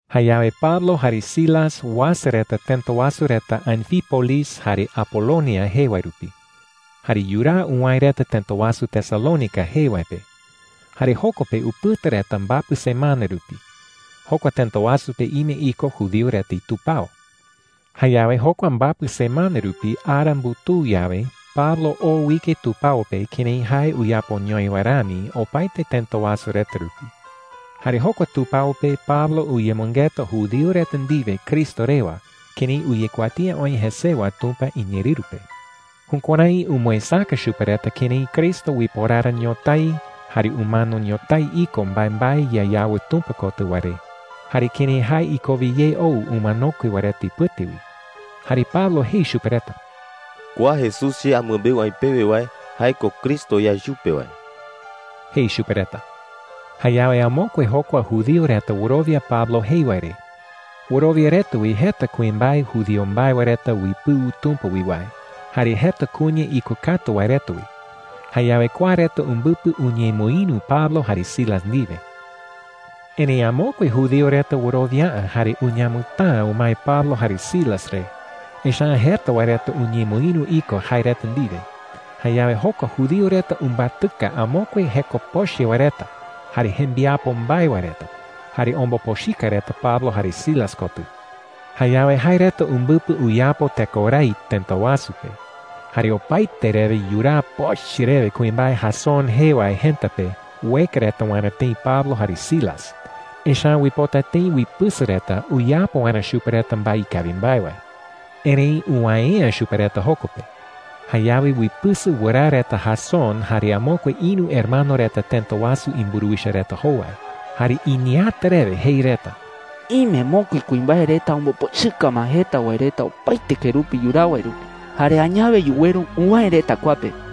Jayawe Pablo jare Silas uasa reta tëta wasu reta Anfípolis jare Apolonia jee wae rupi. Jare yuraa uwäe reta tëta wasu Tesalónica jee wae pe. Jare joko pe upɨta reta mbapɨ semana rupi. Jokua tëta wasu pe ime iko judío reta itupao. Jayawe jokua mbapɨ semana rupi ara mbutuu yawe, Pablo oo uike tupao pe kërái jae uyapoñoi wae rami opaete tëta wasu reta rupi. Jare jokua tupao pe Pablo uyemɨngeta judío reta ndiwe Cristo rewa kërái uyekuatía oï jesewa Tumpa iñeerɨru pe. Jukuärái umɨesäka chupe reta kërái Cristo uiporara ñotái jare umano ñotái iko mbaembae yayawɨ Tumpa kotɨ wae re, jare kërái jae ikowe ye ou umanokue wae reta ipɨte wi. Jare Pablo jei chupe reta: “Kua Jesús che amɨmbeu aï pewe wae, jae ko Cristo yae chupe wae,” jei chupe reta. Jayawe amokue jokua judío reta wɨrowia Pablo jei wae re. Wɨrowia reta wi jeta kuimbae judío mbae wae reta uipɨu Tumpa wi wae, jare jeta kuña ikokatu wae reta wi. Jayawe kua reta umbɨpɨ uñemɨïru Pablo jare Silas ndiwe. Erëi amokue judío reta wɨrowia’ä jare uñamɨtäa umae Pablo jare Silas re, echa’ä jeta wae reta uñemɨïru iko jae reta ndiwe. Jayawe jokua judío reta umbatɨka amokue jeko pochɨ wae reta jare jembiapo mbae wae reta, jare ombopochɨka reta Pablo jare Silas kotɨ. Jayawe jae reta umbɨpɨ uyapo tekorái tëta wasu pe. Jare opaete rewe yuraa pochɨ rewe kuimbae Jasón jee wae jëta pe ueka reta waerä tëi Pablo jare Silas. Echa’ä uipota tëi uipɨsɨ reta uyapo waerä chupe reta mbae ikawi mbae wae. Erëi uwäe’ä chupe reta joko pe. Jayawe uipɨsɨ wɨraa reta Jasón jare amokue ïru hermano reta tëta wasu imburuwicha reta jowai. Jare iñeeäta rewe jei reta: “Ime mokui kuimbae reta ombopochɨka ma jeta wae reta opaete kerupi yuraa wae rupi. Jare añawe yuweru uwäe reta kua pe.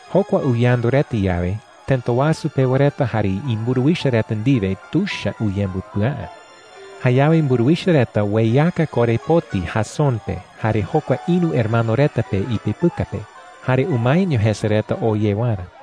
Jokua uyandu reta yawe, tëta wasu pewa reta jare imburuwicha reta ndiwe tuicha uyembɨpɨa’ä. Jayawe mburuwicha reta ueyaka korepoti Jasón pe jare jokua ïru hermano reta pe ipepɨka pe, jare umaeño jese reta oo ye waerä.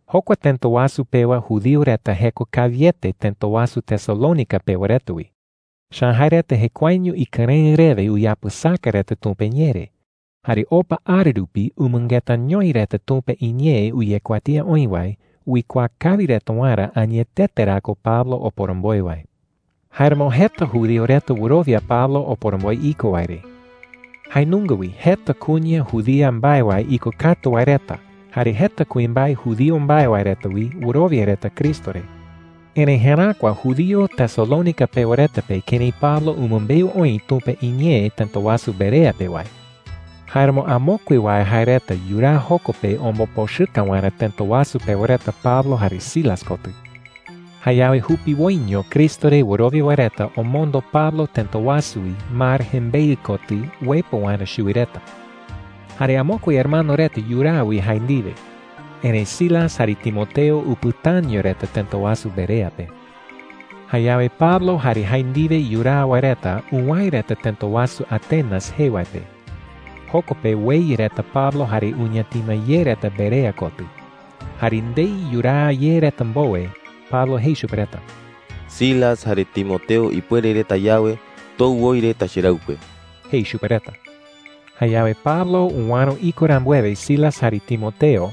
Jokua tëta wasu pewa judío reta jeko kawiete tëta wasu Tesalónica pewa reta wi. Echa’ä jae reta jekuaeño ikɨrëɨ rewe uyapɨsaka reta Tumpa iñee re. Jare opa ara rupi umɨngetañoi reta Tumpa iñee uyekuatía oï wae uikuaa kawi reta waerä añetete ra ko Pablo oporomboe wae. Jáeramo jeta judío reta wɨrowia Pablo oporomboe iko wae re. Jae nunga wi jeta kuña judía mbae wae ikokatu wae reta, jare jeta kuimbae judío mbae wae reta wi wɨrowia reta Cristo re. Erëi jeräkua judío Tesalónica pewa reta pe kërái Pablo umɨmbeu oï Tumpa iñee tëta wasu Berea pe wae. Jáeramo amokue wae jae reta yuraa joko pe ombopochɨka waerä tëta wasu pewa reta Pablo jare Silas kotɨ. Jayawe jupiwoiño Cristo re wɨrowia wae reta omondo Pablo tëta wasu wi mar jembeɨ kotɨ uepɨ waerä chuwi reta. Jare amokue hermano reta yuraa wi jae ndiwe. Erëi Silas jare Timoteo upɨtaño reta tëta wasu Berea pe. Jayawe Pablo jare jae ndiwe yuraa wae reta uwäe reta tëta wasu Atenas jee wae pe. Joko pe ueya reta Pablo jare uñatima ye reta Berea kotɨ. Jare ndei yuraa ye reta mbowe, Pablo jei chupe reta: “Silas jare Timoteo ipuere reta yawe, tou woi reta cheraɨkue,” jei chupe reta. Jayawe Pablo uäro iko rambuewe Silas jare Timoteo,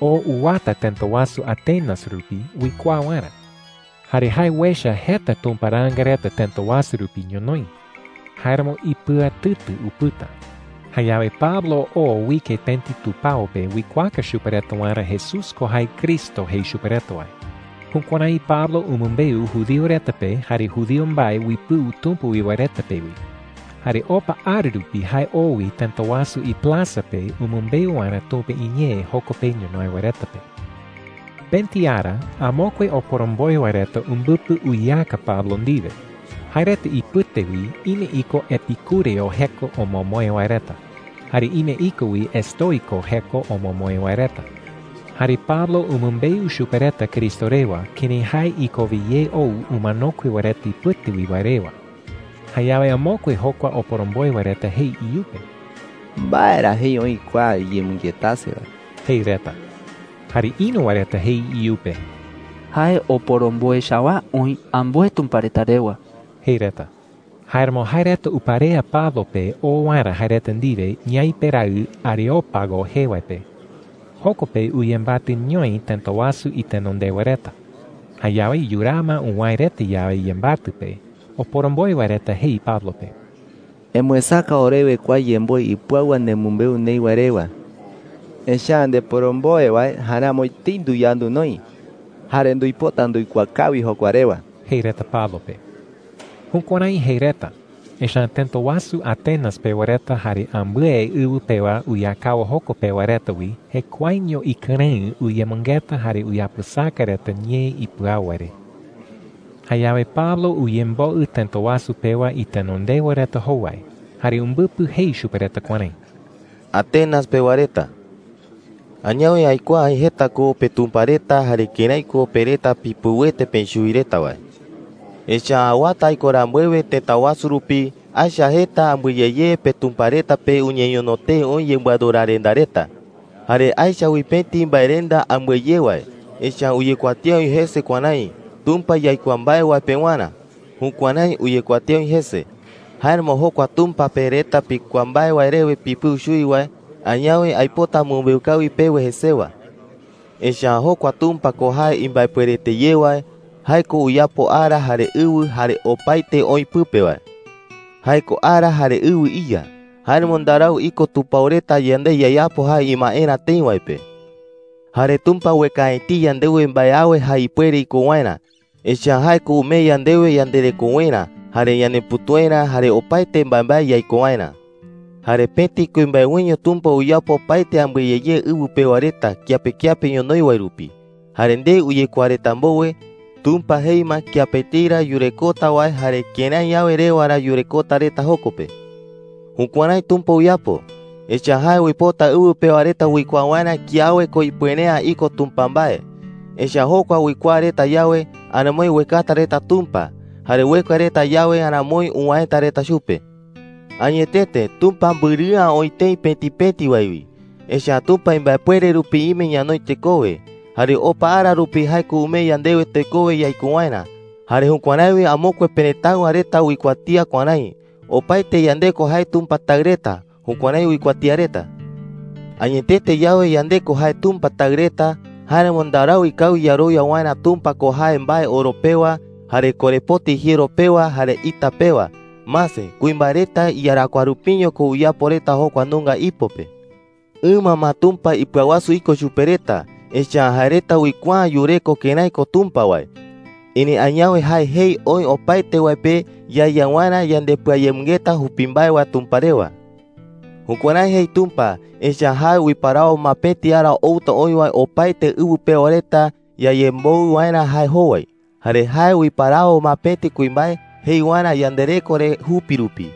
oo uwata tëta wasu Atenas rupi uikuaa waerä. Jare jae uecha jeta tumparaanga reta tëta wasu rupi ñonoï. Jáeramo ipɨatɨtɨ upɨta. Jayawe Pablo oo uike pëti tupao pe uikuaaka chupe reta waerä Jesús ko jae Cristo jei chupe reta wae. Jukuärái Pablo umɨmbeu judío reta pe jare judío mbae uipɨu Tumpa wi wae reta pe wi. Jare opa ara rupi jae oo wi tëta wasu iplaza pe umɨmbeu waerä Tumpa iñee joko pe ñonoï wae reta pe. Pëti ara amokue oporomboe wae reta umbɨpɨ uyeaka Pablo ndiwe. Jae reta ipɨte wi ime iko epikúreo jeko omomoe wae reta, jare ime iko wi estoiko jeko omomoe wae reta. Jare Pablo umɨmbeu chupe reta Cristo rewa, kërái jae ikowe ye ou umanokue wae reta ipɨte wi wae rewa. Jayawe amokue jokua oporomboe wae reta jei iyupe: “¿Mbae ra jei oï kua iyemɨngetase wae?” jei reta. Jare ïru wae reta jei iyupe: “Jae oporomboe chawaa oï ambɨe tumpa reta rewa,” jei reta. Jáeramo jae reta uparea Pablo pe oo waerä jae reta ndiwe ñaipe raɨ Areópago jee wae pe. Joko pe uyembatɨñoi tëta wasu itenondewa reta. Jayawe yuraa ma uwäe reta yawe yembatɨ pe, oporomboe wae reta jei Pablo pe: “Emɨesäka orewe kua yemboe ipɨau wae nemɨmbeu neï wae rewa,” jei reta. “Echa’ä ndeporomboe wae jaeramo etei nduyandu noï. Jare nduipota nduikuaa kawi jokua rewa,” jei reta Pablo pe. Jukuärái jei reta, echa’ä tëta wasu Atenas pewa reta jare ambɨe ɨwɨ pewa uyakao joko pe wae reta wi jekuaeño ikɨrëɨ uyemɨngeta jare uyapɨsaka reta ñee ipɨau wae re. Jayawe Pablo uyemboɨ tëta wasu pewa itenondewa reta jowai jare umbɨpɨ jei chupe reta kuärái: “Atenas pewa reta,” jei. “Añawe aikuaa aï jeta ko petumpa reta jare kërái ko pe reta pipɨuete peï chuwi reta wae,” jei. “Echa’ä awata aiko rambuewe tëta wasu rupi, aecha jeta ambɨe ye ye petumpa reta pe uñeñono tee oï yembɨadorarenda reta,” jei chupe reta. “Jare aecha wi pëti mbaerenda ambɨe ye wae. Echa’ä uyekuatía oï jese kuärái: ‘TUMPA YAIKUAA MBAE WAE PEWARÄ.’ Jukuärái uyekuatía oï jese. Jáeramo jokua Tumpa pe reta pikuaa mbae wae rewe pipɨu chuwi wae, añawe aipota amɨmbeu kawi pewe jesewa,” jei chupe reta. “Echa’ä jokua Tumpa ko jae imbaepuerete ye wae. Jae ko uyapo ara jare ɨwɨ jare opaete oï pɨpe wae,” jei. “Jae ko ara jare ɨwɨ iYa. Jáeramo ndarau iko tupao reta yande yayapo jae imaerä tëi wae pe,” jei. “Jare Tumpa ueka’ä etei yandewe mbae awe jae ipuere iko waerä. Echa’ä jae ko umee yandewe yanderekowerä, jare ñanepütuerä, jare opaete mbaembae yaiko waerä,” jei chupe reta. “Jare pëti kuimbae wiño Tumpa uyapo opaete ambɨe ye ye ɨwɨ pewa reta kiape kiape ñonoï wae rupi. Jare ndei uyekuaa reta mbowe, Tumpa jei ma kiape etei ra yurekota wae jare kërái yawe rewa ra yurekota reta joko pe,” jei. “Jukuärái Tumpa uyapo, echa’ä jae uipota ɨwɨ pewa reta uikuaa waerä kiawe ko ipuere’ä iko Tumpa mbae. Echa’ä jokua uikuaa reta yawe, aramoi uekata reta Tumpa. Jare ueka reta yawe, aramoi uwäeta reta chupe,” jei chupe reta. “Añetete Tumpa mbɨrɨ'ä oï tëi pëti pëti wae wi. Echa’ä Tumpa imbaepuere rupi ime ñanoi tekowe. Jare opa ara rupi jae ko umee yandewe tekowe yaiko waerä. Jare jukuärái wi amokue perëtáɨwa reta uikuatía kuärái: ‘Opaete yande ko jae Tumpa taɨ reta.’ Jukuärái uikuatía reta,” jei chupe reta. “Añetete yawe yande ko jae Tumpa taɨ reta, jáeramo ndarau ikawi yarowia waerä Tumpa ko jae mbae oro pewa, jare korepoti jiero pewa, jare ita pewa. Mase, kuimbae reta iyarakuaa rupiño ko uyapo reta jokua nunga ipo pe,” jei. “Ɨma ma Tumpa ipɨawasu iko chupe reta, echa’ä jae reta uikuaa’ä yureko kërái ko Tumpa wae. Erëi añawe jae jei oï opaete wae pe yaeya waerä yandepɨayemɨngeta jupi mbae wae Tumpa rewa. Jukuärái jei Tumpa, echa’ä jae uiparawo ma pëti ara outa oï wae opaete ɨwɨ pewa reta yayemboɨ waerä jae jowai. Jare jae uiparawo ma pëti kuimbae jei waerä yandereko re jupi rupi.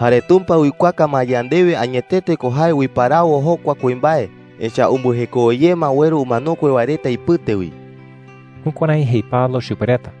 Jare Tumpa uikuaaka ma yandewe añetete ko jae uiparawo jokua kuimbae, echa’ä umbɨjekowe ye ma ueru umanokue wae reta ipɨte wi.” Jukuärái jei Pablo chupe reta.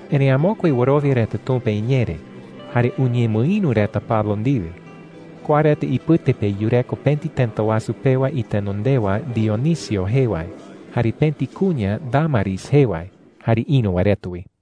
Erëi amokue wɨrowia reta Tumpa iñee re, jare uñemɨïru reta Pablo ndiwe. Kua reta ipɨte pe yureko pëti tëta wasu pewa itenondewa Dionisio jee wae, jare pëti kuña Dámaris jee wae, jare ïru wae reta wi.